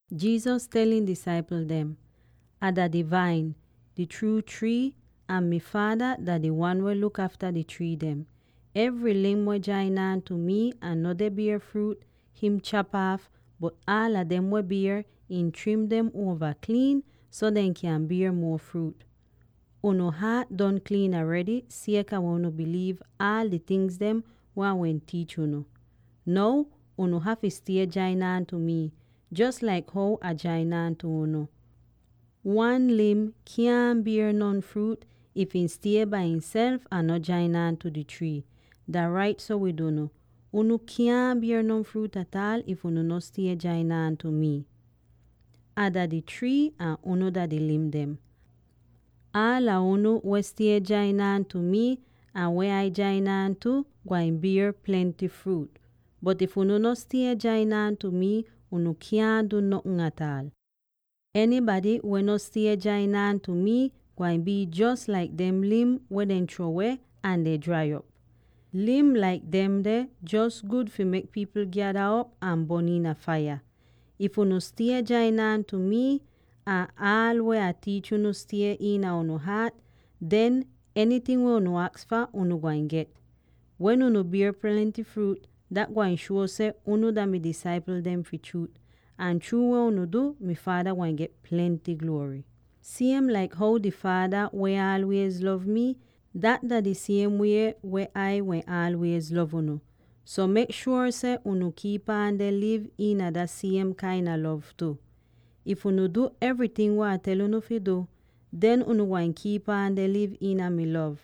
Jesus tel ihn disaipl dem, “Ah dah di Vain, di chruu trii, ahn mi Faada dah di wan weh luk afta di trii dem. Evry lim weh jain aan tu mi ahn no deh bier fruut, him chap aaf, bot aala dem weh bier, ihn trim dem uova kliin so dehn kyan bier muo fruut. Unu haat don kliin aredy sieka weh unu biliiv aal di tingz weh Ah wehn tiich unu. Now, unu hafy stie jain aan tu mi, jos laik how Ah jain aan tu unu. Wan lim kyaahn bier non fruut, if ih stie bai ihself ahn no jain aan tu di trii. Dah rait so wid unu: unu kyaahn bier non fruut ataal, if unu no stie jain aan tu mi. “Ah dah di trii ahn unu dah di lim dem. Aala unu weh stie jain aan tu mii, ahn weh Ah jain aan tu, gwain bier plenty fruut. Bot if unu no stie jain aan tu mii, unu kyaahn du notn ataal. Enybady weh no stie jain aan tu mii gwain bii jos laik dem lim weh dehn chruo weh ahn den drai op. Lim laik demde jos gud fi mek pipl gyada op ahn bon iina faiya. If unu stie jain aan tu mii, ahn aal weh Ah tiich unu stie iina unu haat, den enyting weh unu aks fah unu gwain get. Wen unu bier plenty fruut, dat gwain shuo seh unu dah mi disaipl dem fi chruut, ahn chruu weh unu du, mi Faada gwain get plenty gluory. “Siem laik how di Faada wehn aalwiez lov mii, dat dah di siem wie weh Ai wehn aalwiez lov unu; so mek shuor seh unu kiip aan deh liv iina dah siem kain a lov tu. If unu du evryting weh Ah tel unu fi du, den unu gwain kiip aan deh liv iina mi lov,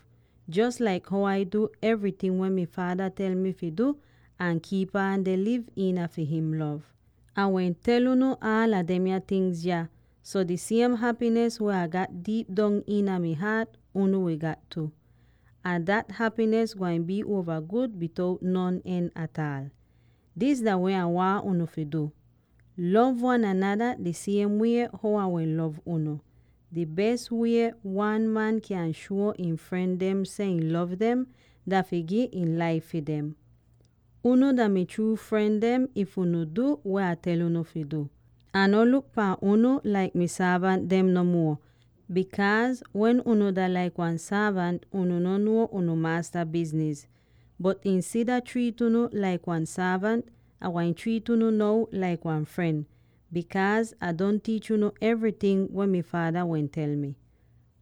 jos laik how Ah du evryting weh mi Faada tel mi fi du ahn kiip aan deh liv iina fi him lov. Ah wehn tel unu aala demya tingz yah, so di siem hapinis weh Ah gat diip dong iina mi haat unu wi gat tu. Ahn dat hapinis gwain bii uova gud bitout non en ataal. “Dis dah weh Ah waahn unu fi du: lov wan anada di siem wie how Ah wehn lov unu. Di bes wie wan man kyan shuo ihn fren dem seh ihn lov dem dah fi gi ihn laif fi dem. Unu dah mi chruu fren dem if unu du weh Ah tel unu fi du. Ah no luk pahn unu laik mi sorvant dem no muo, bikaaz wen unu dah laik wan sorvant, unu no nuo unu maasta bizniz. Bot insida triit unu laik wan sorvant, Ah gwain triit unu now laik wan fren, bikaaz Ah don tiich unu evryting weh mi Faada wehn tel mi.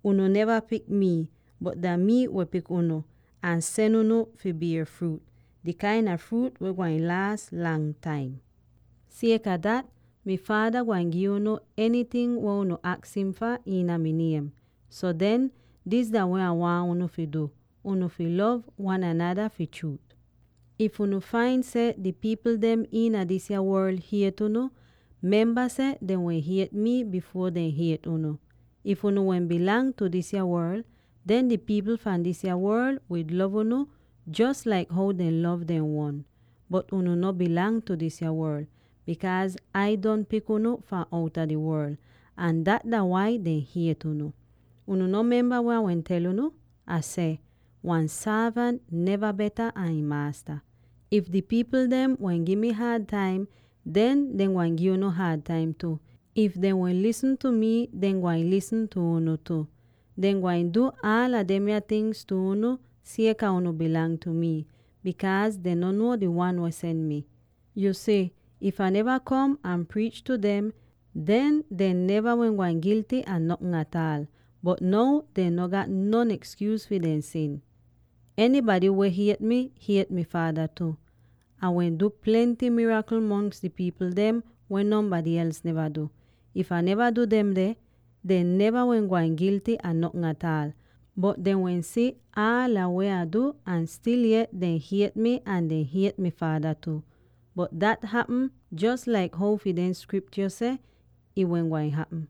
“Unu neva pik mii, bot dah mii weh pik unu ahn sen unu fi bier fruut, di kain a fruut weh gwain laas lang taim. Sieka dat, mi Faada gwain gi unu enyting weh unu aks im fah iina mi niem. So den, dis dah weh Ah waahn unu fi du: Unu fi lov wan anada fi chruut! “If unu fain out seh di pipl dem iina disa worl hiet unu, memba seh dehn wehn hiet mii bifuor dehn hiet unu. If unu wehn dah fi disa worl, den di pipl fahn disa worl wi lov unu jos laik how dehn lov dehn uon. Bot unu dah no fi disa worl, bikaaz Ai don pik unu fahn outa di worl, ahn dat dah wai dehn hiet unu. Unu no memba weh Ah wehn tel unu? Ah seh: ‘Wan sorvant no beta an ihn maasta.’ If di pipl dem wehn gi mi haad taim, den dehn gwain gi unu haad taim tu; if dehn wehn lisn tu mii, dehn gwain lisn tu unu tu. Dehn gwain du aala demya tingz tu unu sieka unu dah fi mii, bikaaz dehn no nuo di Wan weh sen mi. Yu si, if Ah neva kom ahn priich tu dem, den dehn neva wehn gwain gilty a notn ataal, bot now dehn no gat non ekskyuus fi dehn sin. “Enybady weh hiet mii, hiet mi Faada tu. Ah wehn du plenty mirakl mongs di pipl dem weh nonbady els neva du. If Ah neva du demde, dehn neva wehn gwain gilty a notn ataal. Bot dehn wehn si aala weh Ah du ahn stil yet dehn hiet mi ahn dehn hiet mi Faada tu. Bot dat hapm jos laik how fi dehn Skriptyo seh ih wehn gwain hapm: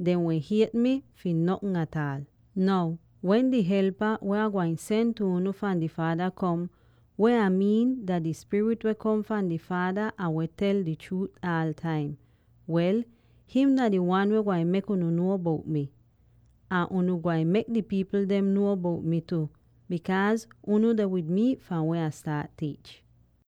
‘Dehn wehn hiet mi fi notn ataal.’ “Now wen di Helpa, weh Ah gwain sen tu unu fahn di Faada kom —weh Ah miin dah di Spirit weh kom fahn di Faada ahn weh tel di chruut aal taim— wel, him dah di Wan weh gwain mek unu nuo bout mii. Ahn unu gwain mek di pipl dem nuo bout mi tu, bikaaz unu deh wid mi fahn wen Ah staat tiich.